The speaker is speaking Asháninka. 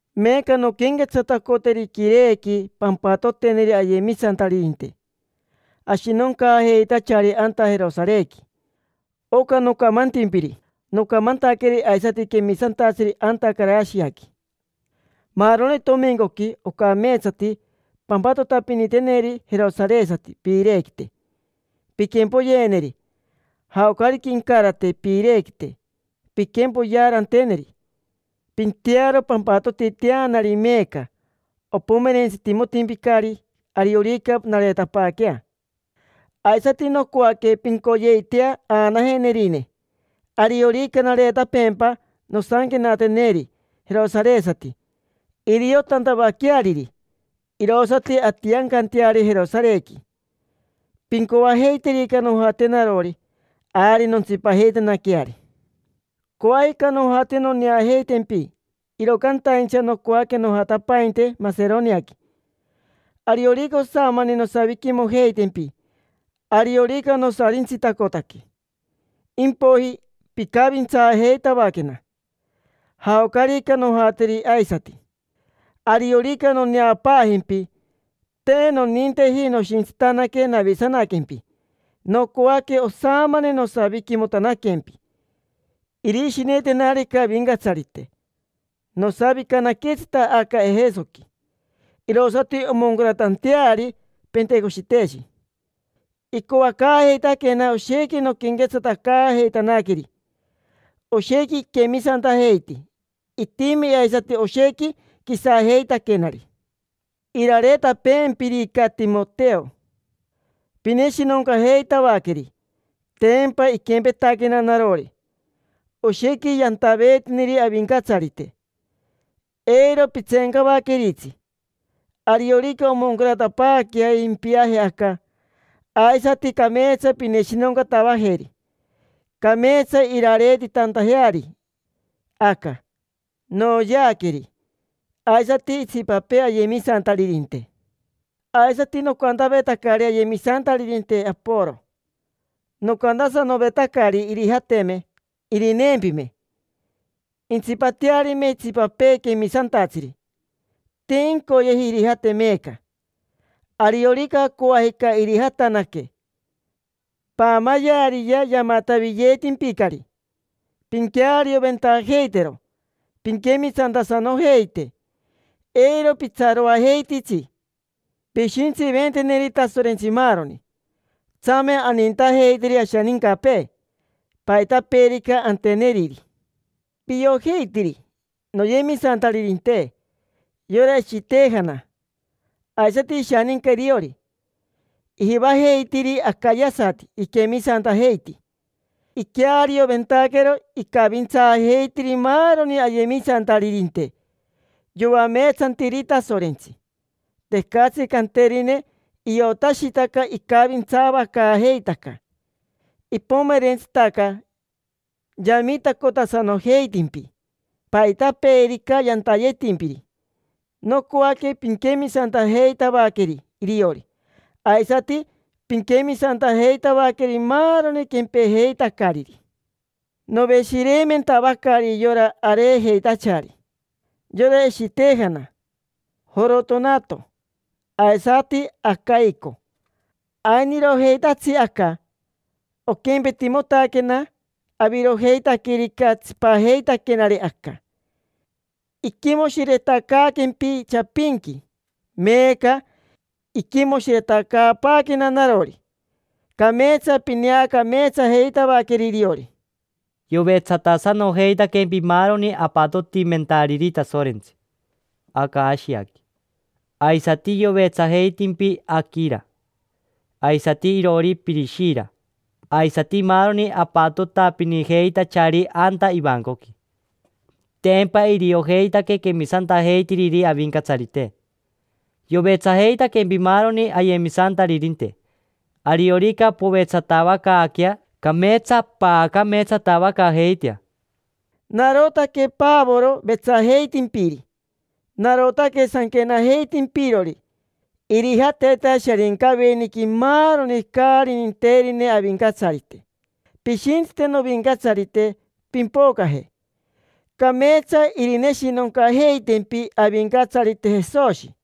Meeca nonquenquetsatacoteri quirequi pampatoteneri ayemisantaririnte ashinoncaajeitachari anta Jerosarequi. Oca nocamantimpiri, nocamantaqueri aisati quemisantatsiri anta Carashiaqui. Maaroni tomincoqui ocameetsati pampatotapiniteneri jerosaresati piirequite, pinquempoyeneri. Jaocarica incarate piirequite, pinquempoyearanteneri. Pintearo pampatotiteanari meeca, opomerentsitimotimpicari ariorica nareetapaaquea. Aisati nocoaque pincoyeitea aanajenerine. Ariorica nareetapeempa, nosanquenateneri jerosaresati, iriotantavaqueariri. Irosati antiancanteari Jerosarequi. Pincoajeiterica nojate narori, ari nontsipajeitanaqueari. Coajica nojate noneajeitempi, iro cantaincha nocoaque nojatapainte Maseroniaqui. Ariorica osamani nosaviquimojeitempi, ariorica nosarintsitacotaque. Impoiji pincavintsaajeitavaquena, jaocarica nojateri aisati. Ariorica noneapaajempi, te noninteji noshintsitanaque navisanaquempi. Nocoaque osamani nosaviquimotanaquempi, irishinetenarica Avincatsarite. Nosavicanaquetsita aca Ejesoqui, irosati omoncaratanteari Pentecoshiteshi. Icoacaajeitaquena oshequi nonquenquetsatacaajeitanaqueri. Oshequi iquemisantajeiti. Itimi aisati oshequi quisajeitaquenari. Irareetapeempirica Timoteo, pineshinoncajeitavaqueri. Tempa iquempetaquena narori, oshequi yantaveetiniri Avincatsarite. Eiro pitseencavaqueritsi. Ariorica omoncaratapaaquea impiaje aca, aisati cameetsa pineshinoncatavajeri, cameetsa irareetitantajeari aca. Noyeaqueri, aisati itsipapee ayemisantaririnte. Aisati nocantavetacari ayemisantaririnte, Aporo. Nocantasanovetacari irijateme irineempime, intsipatearime itsipapee quemisantatsiri. Te incoyeji irijate meeca. Ariorica coajica irijatanaque. Paamayeariyea, yamatavitimpicari. Pinquearioventajeitero pinquemisantasanojeite. Eiro pitsaroajeititsi. Pishintsiventeneri Tasorentsi maaroni. Tsame anintajeiteri ashanincapee, paitapeerica anteneriri. Piojeitiri, noyemisantaririnte, yora Eshitejana aisati ishaninca iriori. Ijivajeitiri Acayasati iquemisantajeiti. Iquearioventaquero icavintsaajeitiri maaroni ayemisantaririnte yoameetsantiri Tasorentsi. Tecatsi canterine, iotashitaca icavintsavacaajeitaca. Ipomerentsitaca yamitacotasanojeitimpi, paitapeerica yantayetimpiri. Nocoaque pinquemisantajeitavaqueri iriori, aisati pinquemisantajeitavaqueri maaroni quempejeitacariri. Noveshireimentavacari yora areejeitachari: yora Eshitejana, Jorotonato, aisati Acaico. Ainirojeitatsi aca, oquempetimotaquena avirojeitaquerica tsipajeitaquenari aca. Iquimoshiretacaaquempi chapinqui, meeca iquimoshiretacaapaaquena narori. Cameetsa pineacameetsajeitavaqueri iriori. Yovetsatasanojeitaquempi maaroni apatotimentariri Tasorentsi aca Ashiaqui. Aisati yovetsajeitimpi Aquira aisati iroori Pirishira, aisati maaroni apatotapinijeitachari anta ivancoqui. Tempa iriojeitaque quemisantajeitiriri Avincatsarite. Yovetsajeitaquempi maaroni ayemisantaririnte. Ariorica povetsatavacaaquea, cameetsa paacameetsatavacaajeitea. Narotaque Pavoro vetsajeitimpiri. Narotaque sanquenajeitimpirori. Irijateta Sharincaveniqui maaroni caari ninterine Avincatsarite. Pishintsite, Novincatsarite, pimpocaje. Cameetsa irineshinoncajeitempi Avincatsarite Jesoshi.